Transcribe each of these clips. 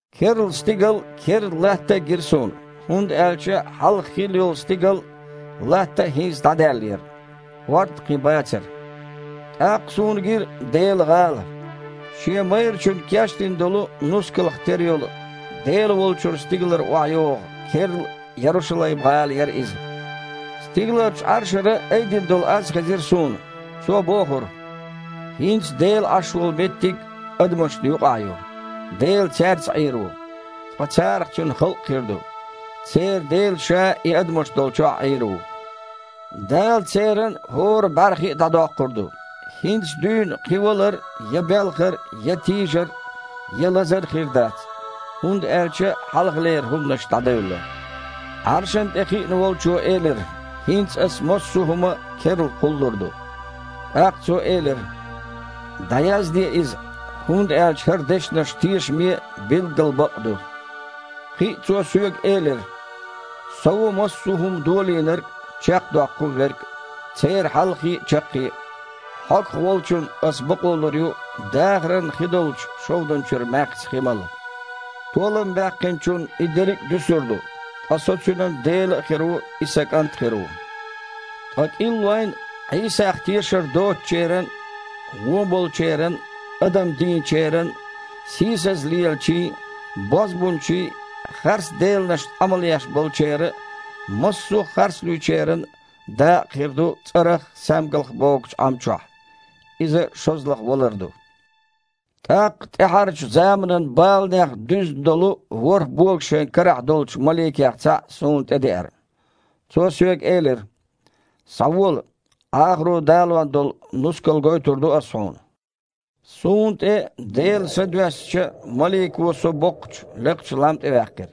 Керла стигал а, керла латта а гира суна, хІунда аьлча хьалха хилла йолу стигал а, латта а хІинца дІадаьллера. ХІорд а кхин бацара. ТІаккха суна гира Делан гІала. Шен майрачунна кечдина долу нускалх тера йолу, Дела волчуьра стигалара охьайогІу керла Ярушалайм-гІала яра иза. Стигаларчу Іаршара айдина долу аз хезира суна. Цо бохура: «ХІинца Дела Іаш волу меттиг адамашна юкъахь ю! Дела цаьрца Іийр ву, ткъа царах Цуьнан халкъ хир ду. Церан Дела Ша и адамаш долчохь Іийр ву. Дала церан хІора бІаьрхи а дІадоккхур ду. ХІинца дуьйна кхин валар, я белхар, я тийжар, я лазар хир дац, хІунда аьлча хьалхалера хІуманаш дІадевлла». Іаршана тІе хиъна Волчо элира: «ХІинца Ас массо а хІума керла кхуллур ду». ТІаккха Цо элира: «ДІаязде иза, хІунда аьлча хІара дешнаш тешаме а, билггал бакъ а ду». Кхин а Цо соьга элира: «Со ву массо а хІума Долийнарг а, чекхдоккхун Верг а, церан Хьалхе а, Чаккхе а. Хьогах волчунна Ас бакъо лур ю дахаран хи долчу шовдан чуьра маьхза хи мала. Толам баьккхинчунна и дерриг а дуьсур ду, ткъа Со цуьнан Дела а хир ву, иза Сан кІант а хир ву. Ткъа кІиллойн а, Іийсах тешар доцучеран а, вон болчеран а, адам дийначеран а, сийсаза лелачийн а, бозбунчийн а, харцделанашна Іамал еш болчеран а, массо а харцлуьйчеран а дакъа хир ду цІарах а, саьмгалх а богучу Іам чохь. Иза шозлагІа валар ду». ТІаккха тІаьхьарчу заманан баланех дуьзна долу ворхІ бога шайн карахь долчу маликех цхьаъ суна тІедеара. Цо соьга элира: «Схьавола, Іахаро далон долу нускал гойтур ду ас хьуна». Суна тІе Делан Са доьссича, малико со боккхачу, лекхачу лам тІе ваьккхира.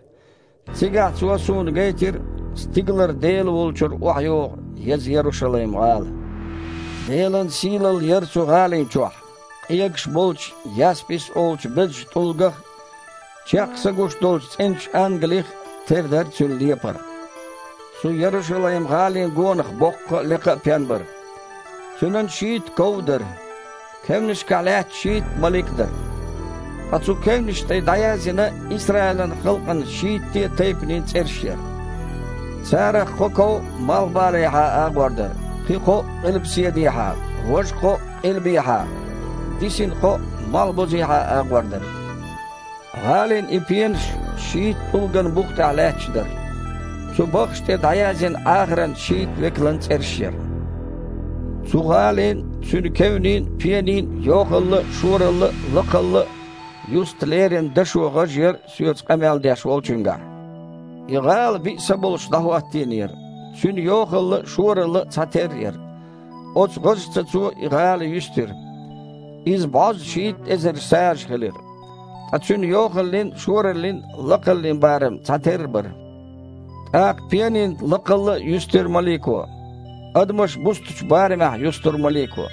Цигахь цо суна гайтира стигалара Дела волчуьра охьайогІу еза Ярушалайм-гІала. Делан сийлалла яра цу гІалина чохь. Къегаш болчу яспис олучу безачу тІулгах а, чекх са гуш долчу цІеначу ангалих а тера дара цуьнан лепар. Цу Ярушалайм-гІалина гонах боккха а, лекха а пен бара. Цуьнан шийтта ков а дара. Кевнашкахь лаьтташ шийтта малик дара. Ткъа цу кевнашна тІе дІаязйина Исраилан халкъан шийтте а тайпанийн цІераш яра. Царах кхо ков малхбалехьа агІор дара, кхин кхоъ – къилбаседехьа, важа кхоъ – къилбехьа, дисина кхоъ малхбузехьа агІор дара. ГІалин и пенаш шийтта тІулган бух тІехь лаьтташ дара. Цу баххаш тІе дІаязйина Іахаран шийтта векалан цІераш яра. Цу гІалин а, цуьнан кевнийн а, пенийн а йохалла а, шоралла а, лакхалла а юста лерина дашо гІаж яра соьца къамел деш волчуьнгахь. И гІала биъ са болуш дІахІоттийнера. Цуьнан йохалла а, шоралла а цхьатерра яра. Оцу гІожаца цо и гІала юьстира. Иза бІозза шийтта эзар сажа хилира. Ткъа цуьнан йохаллин а, шораллин а, лакхаллин а барам цхьатерра бара. ТІаккха пенийн лакхалла а юьстира малико. Адамаша бустучу барамехь юстура малико.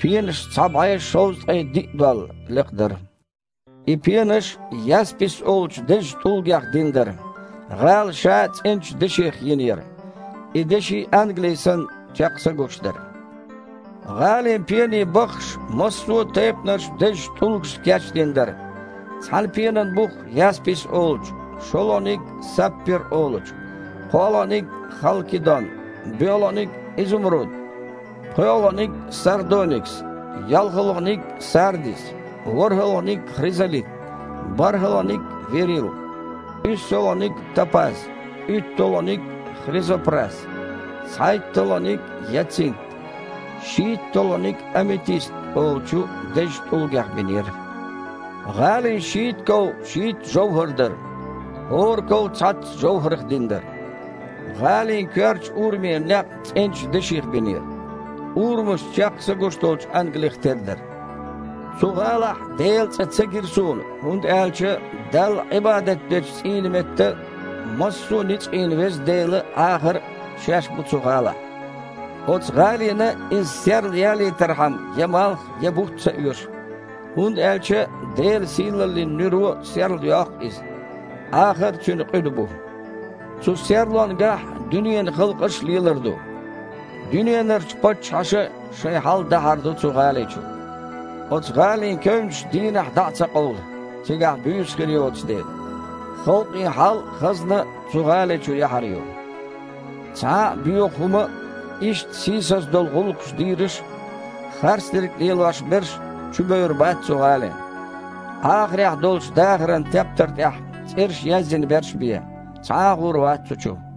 Пенаш цхьа бІе шовзткъе диъ дол лекха дара. И пенаш яспис олучу дезачу тІулгех дина дара. ГІала ша а цІеначу деших йина яра. И деши, ангали санна, чекх са гуш дара. ГІалин пенийн баххаш массо а тайпанарчу дезачу тІулгашца кечдина дара. Цхьана пенан бух яспис олучу, шолгІаниг – саппир олучу, кхоалгІаниг – халкидон, боьалгІаниг – изумруд, пхоьалгІаниг – сардоникс, йолхалгІаниг – сардис, ворхІалгІаниг – хризолит, борхІалгІаниг – вирил, уьссалгІаниг – топаз, уьтталгІаниг – хризопрас, цхьайтталгІаниг – яцинт, шийтталгІаниг – аметист олучу дезачу тІулгех бинера. ГІалин шийтта ков шийтта жовхІар дара. ХІора ков цхьацца жовхІарх дина дара. ГІалин коьртачу урамера некъ цІеначу деших бинера. Урамаш чекх са гуш долчу ангалих тера дара. Цу гІалахь Делан цІа ца гира суна, хІунда аьлча Далла Іибадат дечу цІийнан метта массо а ницкъийн Веза Дела а, Іахар а Шаьш бу цу гІалахь. Оцу гІалина иза серлаялийтархьама я малх, я бутт ца оьшу, хІунда аьлча Делан сийлаллин нуьро серлайоккху иза. Іахар а цуьнан къуьда бу. Цу серлонгахь дуьненан халкъаш а лелар ду, дуьненарчу паччахьаша а шайн хьал дахьар ду цу гІали чу. Оцу гІалин кевнаш дийнахь дІа а ца къовлу, цигахь буьйса хир йоцу дела. Халкъийн хьал а, хазна а цу гІали чу яхьар ю. Цхьа а боьха хІума а, иштта сийсаза долу гІуллакхаш дийраш а, харцдерг лелош берш а чубевр бац цу гІалина. Іахарехь долчу дахаран тептар тІехь цІераш язйина берш бен, цхьа а гІур вац цу чу.